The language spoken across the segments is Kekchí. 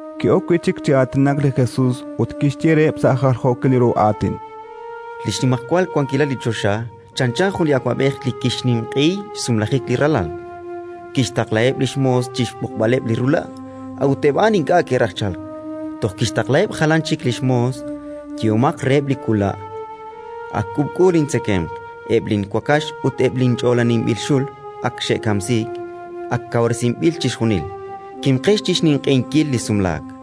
Ki'ok wi' chik chi aatinak li Jesus ut kixye reheb' sa' jaljookil ru aatin: “Li xnimajwal wankilal li choxa chanchan jun li awab'ej li kixninq'ehi xsumlajik li ralal. Kixtaqlaheb' li xmoos chi xb'oqb'aleb' li rula', a'ut eb' a'an ink'a' ke'raj chalk. Toj kixtaqlaheb' jalan chik li xmoos: «Yehomaq reheb' li wula': Ak k'uub'k'u lintzekemq; eb' linwakax ut eb' linch'oolaninb'il xul ak xe'kamsiik. Ak kawresinb'il chixjunil. Kimqex chi xninq'ehinkil li sumlaak!».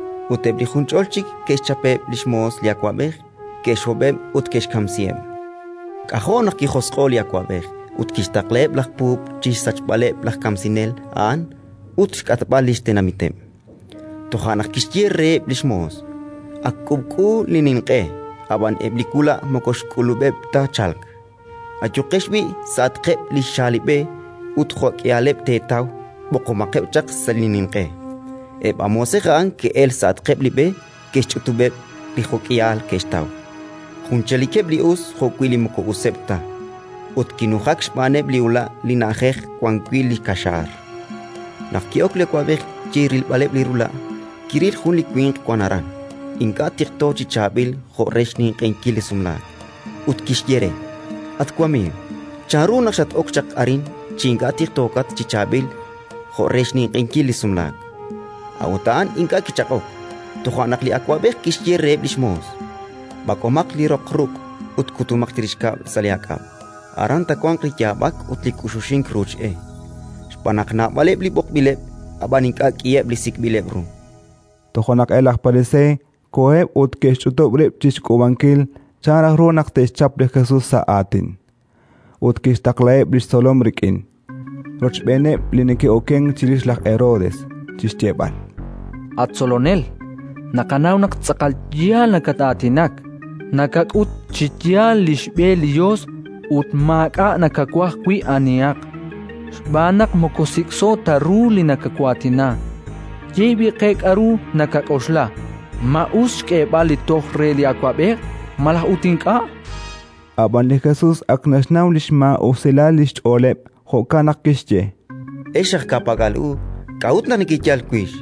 ut eb' li junch'ol chik ke'xchapeb' li xmoos li awab'ej, ke'xhob'eb' ut ke'xkamsiheb'. “K'ajo' naq kijosq'o'k li awab'ej, ut kixtaqlaheb' laj puub' chi xsachb'aleb' laj kamsinel a'an ut xk'atb'al li xtenamiteb'. Toja' naq kixye reheb' li xmoos: «Ak k'uub'k'u li ninq'e, ab'an eb' li wula' moko xk'ulub'eb' ta chalk. Ayuqex b'i' sa'atqeb' li xaalib'e, ut jo'k'ihaleb' teetaw, b'oqomaqeb' chaq sa' li ninq'e». Eb' a moosej a'an ke'elk sa'atqeb' li b'e, ke'xch'utub'eb' li jo'k'ihal ke'xtaw, jun chalikeb' li us jo'wi' li moko useb' ta. Ut kinujak xb'aaneb' li ula' li na'ajej wan wi' li kaxaar. “Naq ki'ok li awab'ej chi rilb'aleb' li rula', kiril jun li winq wank aran, ink'a' tiqto chi chaab'il jo' re xninq'ehinkil li sumlaak, ut kixye re: «At wamiiw, chanru naq xat-ok chaq arin chi ink'a' tiqtookat chi chaab'il jo' re xninq'ehinkil li sumlaak?». A'ut a'an ink'a' kichaq'ok. Toja' naq li awab'ej kixye reheb' li xmoos: «B'ak'omaq li roq ruq' ut kutomaq chirix kab'l sa' li aak'ab'; aran taawanq li yaab'ak ut li k'uxuxink ruuch e». Xb'aan naq naab'aleb' li b'oqb'ileb', ab'an ink'a' k'iheb' li sik'b'ileb' ru”. Toja' naq eb' laj Pariseey koheb' ut ke'xch'utub' rib' chi xk'uub'ankil chan raj ru naq te'xchap li Jesus sa' aatin. Ut ke'xtaqlaheb' li xtzolom rik'in, rochb'eeneb' li neke'okenk chirix laj Herodes, chi xyeeb'al: —At Tzolonel, naqanaw naq tz'aqal yaal nakat-aatinak; nakak'ut chi yaal li xb'e li Yos ut maak'a' nakawaj wi' anihaq, xb'aan naq moko sik'so ta ru li nakawaatina. Ye b'i' qe k'aru nakak'oxla: Ma us xk'eeb'al li toj re li awab'ej, malaj ut ink'a'? Ab'anan li Jesus ak naxnaw li xmaa'usilal li xch'ooleb'; jo'kan naq kixye: —Ex aj ka'pak'al u, k'a'ut naq nekeyal wix?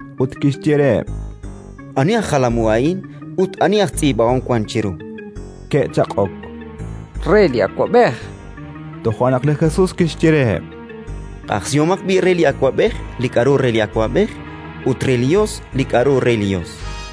Ut kixye reheb': —Ani aj jalam u a'in ut ani aj tz'iib'ahom wank chiru? Ke'chaq'ok: —Re li awab'ej, chankeb'. Toja' naq li Jesus kixye reheb': —Q'ajsihomaq b'i' re li awab'ej li k'aru re li awab'ej, ut re li Yos li k'aru re li Yos.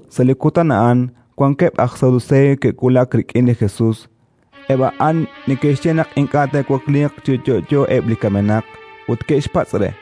Sa' li kutan a'an wankeb' aj Saduseey ke'wulak rik'in li Jesus (eb' a'an neke'xye naq ink'a' te'wakliiq chi yo'yo eb' li kamenaq), ut ke'xpatz' re: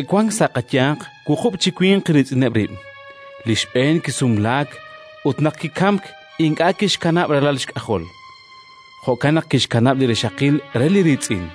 Ke'wank sa' qayanq wuqub' chi winq riitz'ineb' rib'. Li xb'een kisumlaak ut, naq kikamk, ink'a' kixkanab' ralal xk'ajol; jo'kan naq kixkanab' li rixaqil re li riitz'in.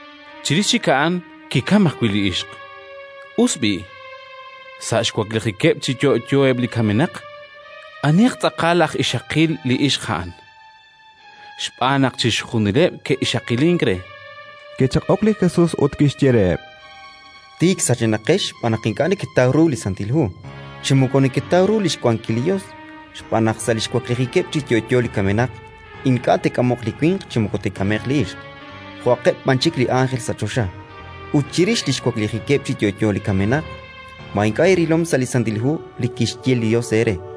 Chirix chik a'an kikamk ajwi' li ixq. Us b'i', sa' xwaklijikeb' chi yo'yo eb' li kamenaq, anihaq tz'aqal aj ixaqil li ixq a'an? Xb'aan naq chixjunileb' ke'ixaqilink re. Kichaq'ok li Jesus ut kixye reheb': —Tik sachenaqex xb'aan naq ink'a' neketaw ru li Santil Hu, chi moko neketaw ru li xwankil li Yos. Xb'aan naq sa' li xwaklijikeb' chi yo'yo li kamenaq ink'a' te'k'amoq li winq chi moko te'k'ame'q li ixq, jo'aqeb' b'an chik li ánjel sa' choxa. Ut chirix li xwaklijikeb' chi yo'yo li kamenaq, ma ink'a' eerilom sa' li Santil Hu li kixye li Yos eere: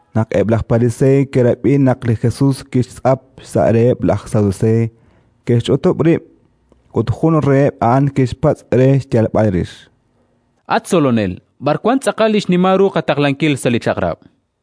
Naq eb' laj Pariseey ke'rab'i naq li Jesus kixtz'ap xsa' reheb' laj Saduseey, ke'xch'utub' rib', ut jun reheb' a'an kixpatz' re yal re xyalb'al rix: —At Tzolonel, b'ar wank tz'aqal li xnimal ru qataqlankil sa' li Chaq'rab'?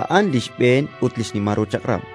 A'an li xb'een ut xnimal ru chaq'rab'.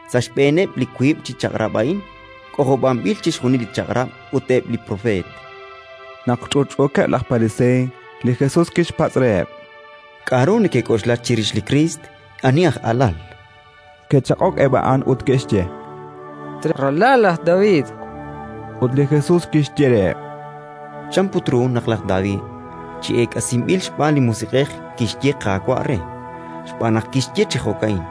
Sa' xb'eeneb' li wiib' chi chaq'rab' a'in k'ojob'anb'il chixjunil li Chaq'rab' ut eb' li Propeet. Naq ch'utch'uukeb' laj Pariseey, li Jesus kixpatz' reheb': —K'aru nekek'oxla chirix li Kriist? Ani aj alal? Ke'chaq'ok eb' a'an ut ke'xye: —Ralal laj David. Ut li Jesus kixye reheb': —Chan put ru naq laj David chi eek'asinb'il xb'aan li Musiq'ej kixye Qaawa' re? Xb'aan naq kixye chi jo'ka'in: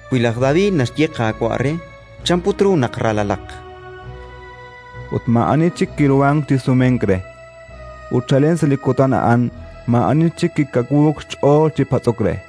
Wi laj David naxye Qaawa' re, chan put ru naq ralalaq? Ut maa'ani chik kiruhank chi sumenk re; ut chalen sa' li kutan a'an maa'ani chik kikawuuk xch'ool chi patz'ok re.